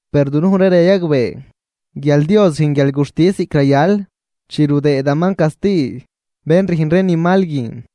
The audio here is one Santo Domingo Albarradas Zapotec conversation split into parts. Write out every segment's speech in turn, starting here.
Per dunuj ree rayagbee guial Dios rüjn guialguxtis ziꞌc rayal, chi rudëëdaman casti bén rüjn ree ni mal guin.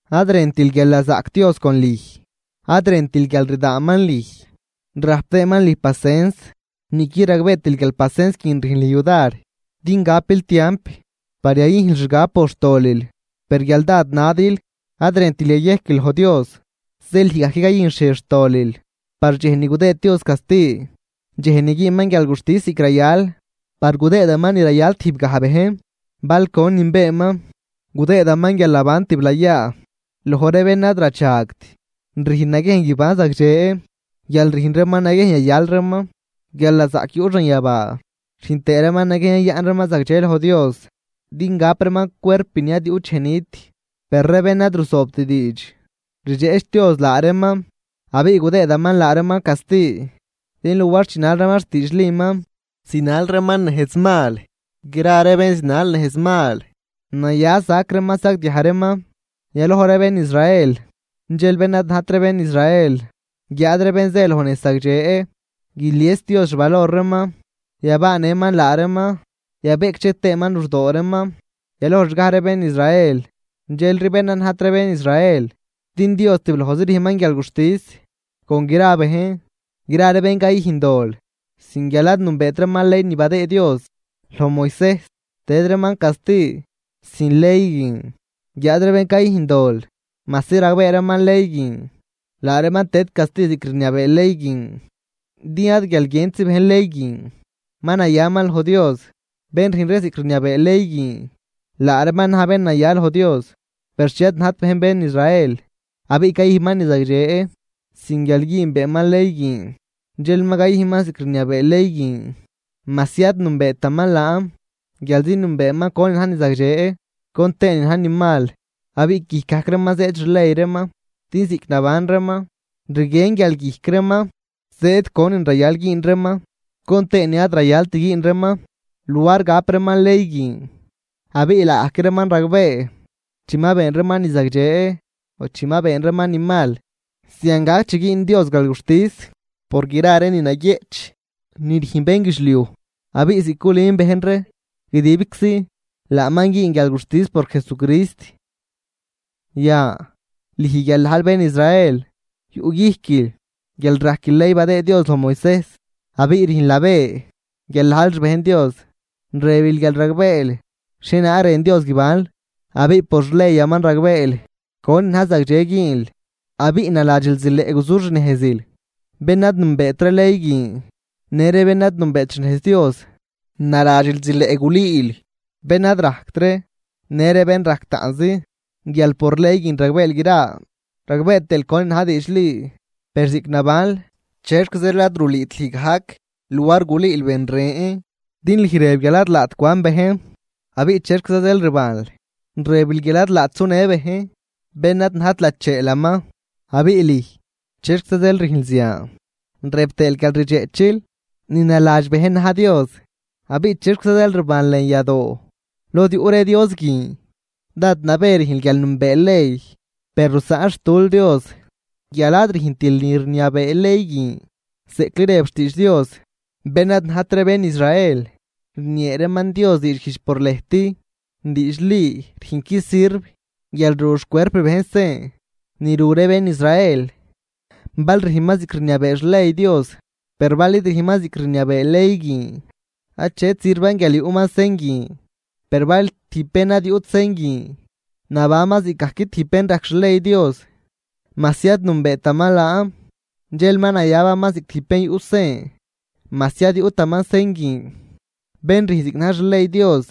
Ad rëntil guialnazaꞌc Dios con lüj, ad rëntil guial rdaanman lüj rajp tëëman lüj pacens, niꞌquid ragbeetil guial pacens guin rüjn lüj yudar din gapil tiamp par yayüjnl xgab por xtolil. Per guial dád nadil, ad rëntil yayejquil loj Dios, zeel lüj gajc cayüjnxhiej xtolil par dxej ni gudëëd Dios casti, dxej ni güünman guialguxtis ziꞌc rayal. Par gudëëman ni rayal tijbgaj bejn bal gonin beenman. Gudëëdaman guialnaban tiblayaa loj ree bén ad radxagt rüjn naguiejn guiban zagdxe guial rüjn reeman naguiejn yayal reeman guialnazaꞌc yuꞌ xanyabaa, rüjn tëë reeman naguiejn yayaꞌn reeman zagdxe loj Dios din gap reeman cuerp ni ad yuꞌt dxej nit. Per ree bén ad ruzoobt diidx, rdxeꞌch Dios laa reeman abiꞌ gudëëdaman laa reeman casti, din luar chinal reeman xtiidxliman, zinal reeman nejz mal. Gra ree bén zinal nejz mal, naya sac reeman sagdiaj reeman, yaloj ree bén Israel dxel bén ad najt ree bén Israel. Guiáad ree bén zë loj nejz zagdxe, guilies Dios xvalor reeman, yabaanëman laa reeman, yabeꞌcdxe tëëman luxdoo reeman, yaloj xgaj ree bén Israel dxelri bén ad najt ree bén Israel. Din Dios tiblojzi rüjnman guialguxtis con gra bejn. Gra ree bén cayüjn dol sin guial ad nünbeet reeman ley badëëd Dios loj Moisejs, tëd reeman casti sin ley guin. Guiáad ree bén cayüjn dol majsi ragbee reeman ley guin, laa reeman tëd casti ziꞌc rniabee ley guin. Din ad guial guientzi bejn ley guin ma nayaman loj Dios, bén rüjn ree ziꞌc rniabee ley guin laa reeman na̱j bén naya loj Dios. Per chi ad najt bejn bén Israel, abiꞌ cayüjnman ni zagdxe sin guial güünbeeman ley guin, dxel ma cayüjnman ziꞌc rniabee ley guin majsi ad nünbeetaman laan, guialzi nünbeeman conin na̱j ni zagdxe con tëë nin na̱j ni mal, abiꞌ guijc gajc reeman zëëd xley reeman. Din ziꞌc naban reeman, rguien guial guijc reeman zëëd conin rayal güün reeman con tëë nin ad rayalt güün reeman luar gap reeman ley guin. Abiꞌ laagajc reeman ragbee chi ma been reeman ni zagdxe o chi ma been reeman ni mal. Zian gac chi güün Dios guialguxtis por gra ree ni naguieꞌch ni rüjn bénguidxliuj. Abiꞌ ziꞌc culün bejn ree guidibczi, laaman güün guialguxtis por Jesucrist. Yan, lüj guial najl bén Israel yuꞌguijquil guial rajquil ley badëë Dios loj Moisejs, abiꞌ rüjnl nabë guial najl xbejn Dios, rëbil guial ragbeel xhienaag rën Dios guibanl, abiꞌ por xleyaman ragbeel conin na̱j zagdxe güünl. Abiꞌ naladxil zileꞌ guzuxnejzil bén ad nünbeet ree ley guin në ree bén ad nünbeet xnejz Dios, naladxil zileꞌ gulüül bén ad rajct ree në ree bén rajc taꞌnzi, guial por ley guin ragbeel gra, ragbee tëël conin na̱j diidxli. Per ziꞌc nabanl, ¿chexc zeel ad rulüüt lüj gajc luar gulüül ben ren? Din lüj rëb guial ad laat cwan bejn, abiꞌ, ¿chexquiza zeel rbanl? Rëbil guial ad laat sunë bejn bén ad najt lacheelaman, abiꞌ lüj, ¿chexquiza zeel rüjnl zian? Rëb tëël guial rdxeꞌchil ni naladx bejn na̱j dios, abiꞌ, ¿chexquiza zeel rbanl lën yadoo lod yuꞌ ree Dios guin? Dád nabë rüjnl guial nünbeel ley, per rusaꞌnxtul Dios guial ad rüjntil ni rniabee ley guin. Zeꞌcli rëb loj xtiidx Dios: “Bén ad najt ree bén Israel rniee reeman Dios diidxguijdx por lëjt.” Diidxli rüjnqui sirv guial ru xcuerp bejn sen ni ru ree bén Israel, bal rüjnman ziꞌc rniabee xley Dios. Per bal id rüjnman ziꞌc rniabee ley guin, achet sirvan guial yuꞌman sen guin. Per bal tijb bén ad yuꞌt sen guin nabanman ziꞌcgajc tijb bén rajc xley Dios majsi ad nünbeetaman laan, dxel ma nayabaman ziꞌc tijb bén yuꞌ sen, majsi ad yuꞌtaman sen guin. Bén rüjn ziꞌc na̱j xley Dios,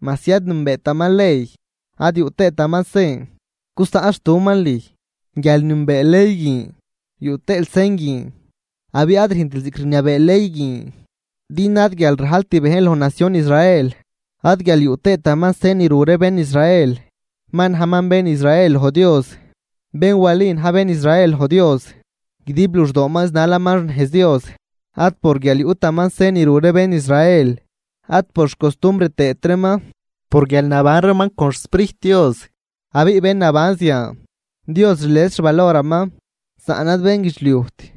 majsi ad nünbeetaman ley ad yuꞌ tëëtaman sen, gusaꞌnxtuꞌman lüj guial nünbeel ley guin yuꞌ tëël sen guin, abiꞌ ad rüjntil ziꞌc rniabee ley guin. Din ad guial rajlt bejn loj nacion Israel, ad guial yuꞌ tëëtaman sen ni ru ree bén Israel ma najman bén Israel loj Dios, bén wali na̱j bén Israel loj Dios, guidib luxdooman zinalaman xnejz Dios, ad por guial yuꞌtaman sen ru ree bén Israel, ad por xcostumbr tëët reeman, por guial naban reeman con xSprijt Dios. Abiꞌ bén naban zian, Dios rlies xvaloraman saꞌn ad bénguidxliujt.